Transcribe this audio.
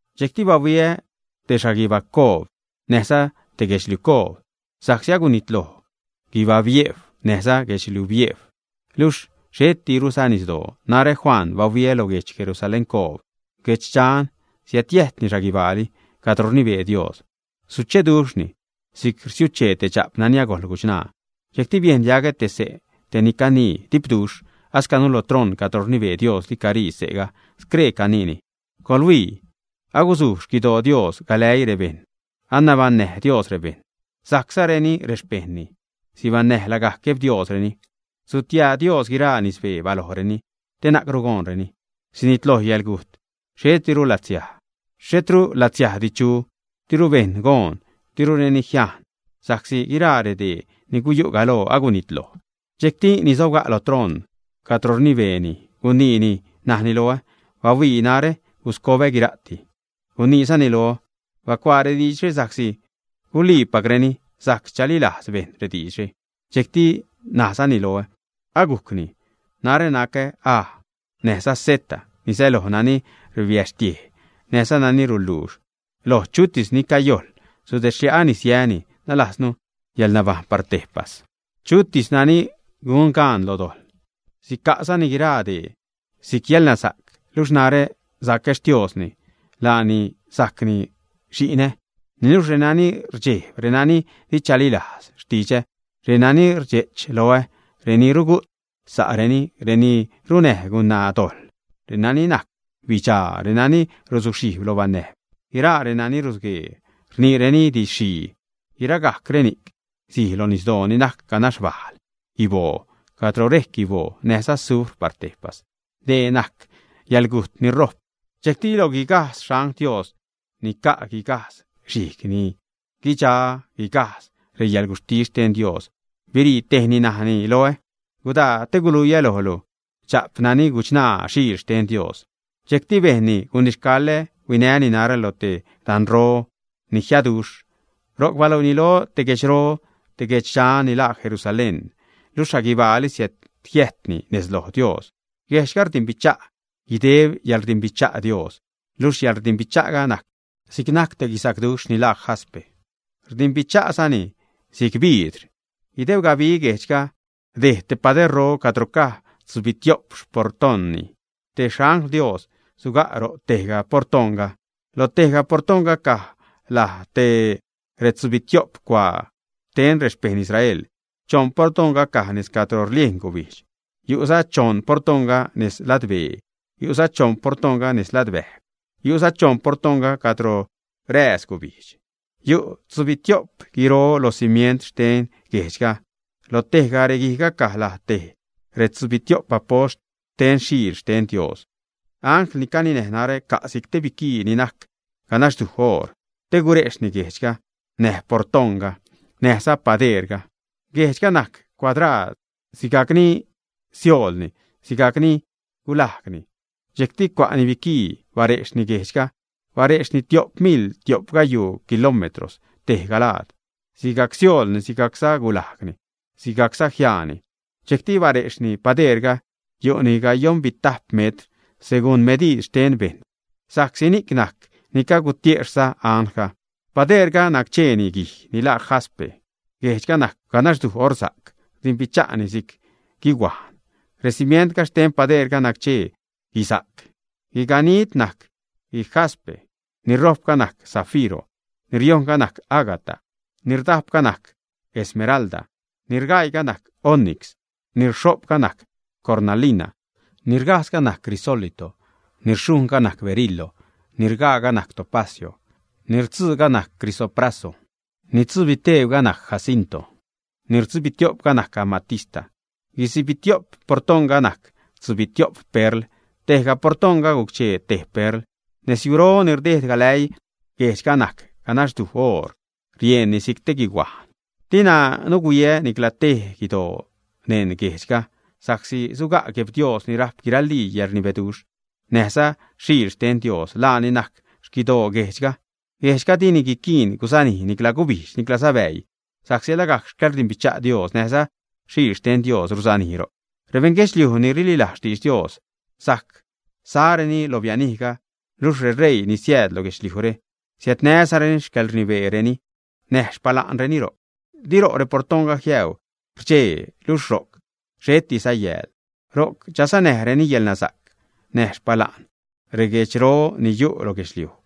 Dxejcti bahuiä te xhaguibacoob näjza te guedxliucoob, sa'csi agunitloj guibabiejw, näjza guedxliubiejw, luxh xhettiruza nisdoo. Narä Juan, bahuiä lo guedx Jerusaléncoob, guedxdxan, siädjiäjtni xhaguibaali cadro rnibee Dios. Sucheduxhni si'c rsiuchee te dxa'p nani agojl guchṉaa. Dxejcti biejn diagä te xse' te ni canii dipduxh, ascanu lo troṉ cadro rnibee Diosli carii se'ga, scree caniini: ―Coḻhuii, aguzuj xquidoo Dios galäii rebejṉ, anabaṉnäj Dios rebejṉ, sajczareni rexpejṉni. Sibaṉnäj lagajc Gueb Diosreni. Sutia Dios guiraa nisbee balojreni te na'cru goonreni. Sinitloj yäḻgujt, xhetru xliajsdi chu, diru bejṉ goon, dirureni jiajn, sa'csi guiraa redee ni guyu' galoo agunitloj. Dxejcti ni sobga' lo troṉ cadro rnibeeni guniini, najni loä: ―Bahuii, najrä guscobä guira'ti. Guniizani loä: ―Bacuaa rediidxre, sa'csi guliipacreni, sajc chalilajz bejṉ rediidxre. Dxejcti najzani loä: ―Agujcni. Narä nacä A näjza Z, ni säloj nani rbaxtiej näjza nani ruluux. Lo chutis ni cayojl, sudedxlia'ä nis yäni, nalajznu yäḻnabajṉ par tejpas. Chutis nani gun gaan lo dojḻ, sica'zani guiraa dee si'c yäḻnasa'c, luxh narä sacä Xtiosni, laani sacni xi'nä. Niluxh renani rdxejb, renani di chalilajz xtidxä, reni rdxe'ch loä, reni rugu't sa'reni, reni runnäj gunaa dojḻ, renani najc bidxaa, renani rusuxhijb lo banäjb, guiraa renani rusguee rniireni didxxhii, guiragajc reni'c sij lo nisdoo ni najc ganax bal guiboo, cadro rejc guiboo näjza sufr par tejpas. Dee ni najc yäḻgujt ni rojp. Dxejcti lo guigajdz xangl Dios ni ca' guigajdz xhijg ni guidxa guigajdz reyäḻguxhtis xten Dios, birii tejni, najni loä: ―Gudaa, te guluiä lojlu dxa'p nani guchṉaa Xiil xten Dios. Dxejcti bejnni gunixcaḻä, huinäni narä lo te danro ni jiaduxh, ro'c baluiini loä te guedxro, te guedxdxan ni laa Jerusalén, luxh xhaguibaali siädjiäjtni nez lo Dios. Guejdxga rdimbicha' guideb xcäḻrdimbicha' Dios. Luxh yäḻrdimbicha'ga najc si'c najc te guisacduxh ni laa jaspe, rdimbicha'zani si'c biidr. Guideb gabi guejdxga dejd te paderro cadro caj tzubitio'p xportoṉroni. Te angl xten Dios suga' ro' tejga portoṉga. Loj tejga portoṉga, caj laj tej retzubitio'p cuaa xten rexpejṉ Israel. Choṉ portoṉga caj nez cadro rliejn gubijdx, yu'za choṉ portoṉga nez ladbee, yu'za choṉ portoṉga nez ladbäjw, yu'za choṉ portoṉga cadro rääz gubijdx. Yu' tzubitio'p guiro lo cimient xten guejdxga. Lo tejga reguijga caj laj tej retzubitio'p apost xten Xiil xten Dios. Angl ni caninäj narä ca' si'c te biquii ni najc ganaxduj oor te gurejxhni guejdxga, näj reportoṉga, näjza padeerga. Guejdxga najc cuadraad: sigajc ni sioolni, sigajcza ni gulajgni. Dxejcti cua'ni biquii barejxni guejdxga, barejxni tio'p miḻ tio'p gayuu kilómetros tejga laad. Sigajc sioolni, sigajcza gulajgni, sigajcza jiaani. Dxejcti barejxni padeerga, yu'ni gayoṉbitajp metr seguṉ mediid xten bejṉ, sa'csi ni'c najc ni cagutiexhnäjza anglga. Padeerga naccheeni guij ni laa jaspe. Guejdxga najc ganaxduj orsa'c, rdimbicha'ni si'c guihuajn. Recimient xten padeerga nac-chee guisa'c. Guiganid najc guijaspe; ni rojpga najc zafiro; ni riojṉga najc ágata; ni rdajpga najc esmeralda; ni rgaiiga najc onix; ni rxho'pga najc cornalina; ni rgajdzga najc crisólito; ni rxhujṉga najc berilo; ni rgaaga najc topacio; ni rtzuuga najc crisopraso; ni rtzubiteebga najc jacinto; ni rdzubitio'pga najc amatista. Guitzubitio'p portoṉga najc tzubitio'p perl. Tejga portoṉga guc-chee tej perl. Nezyuro ni rdeed galäii guejdxga najc ganaxduj oor, rieṉni si'c te guihuajn. Dina nuhuiä nicla tej guidoo neṉ guejdxga, sa'csi suga' Gueb Dios ni rajp guiralii yäḻrnibeduxh, näjza Xiil xten Dios. Laani najc xquidoo guejdxga. Guejdxga dini guiquiin gusanij nicla gubijdx niclaza bäii, sa'csi lagajc xcäḻrdimbicha' Dios näjza Xiil xten Dios ruzanij ro'c. Rebejṉ guedxliuj ni rililajz xtidx Dios sajc sareni lo bianijga, luxh reṟeii ni siääd lo guedxliujre siädnäzareni xcäḻrnibeereni, näj xpala'nreni ro'c. Di ro' reportaṉga jiäuu rdxej, luxh ro'c xhettiza yääl. Ro'c chanäzareni yäḻnasa'c näj xpala'n reguejdxro ni yu' lo guedxliuj.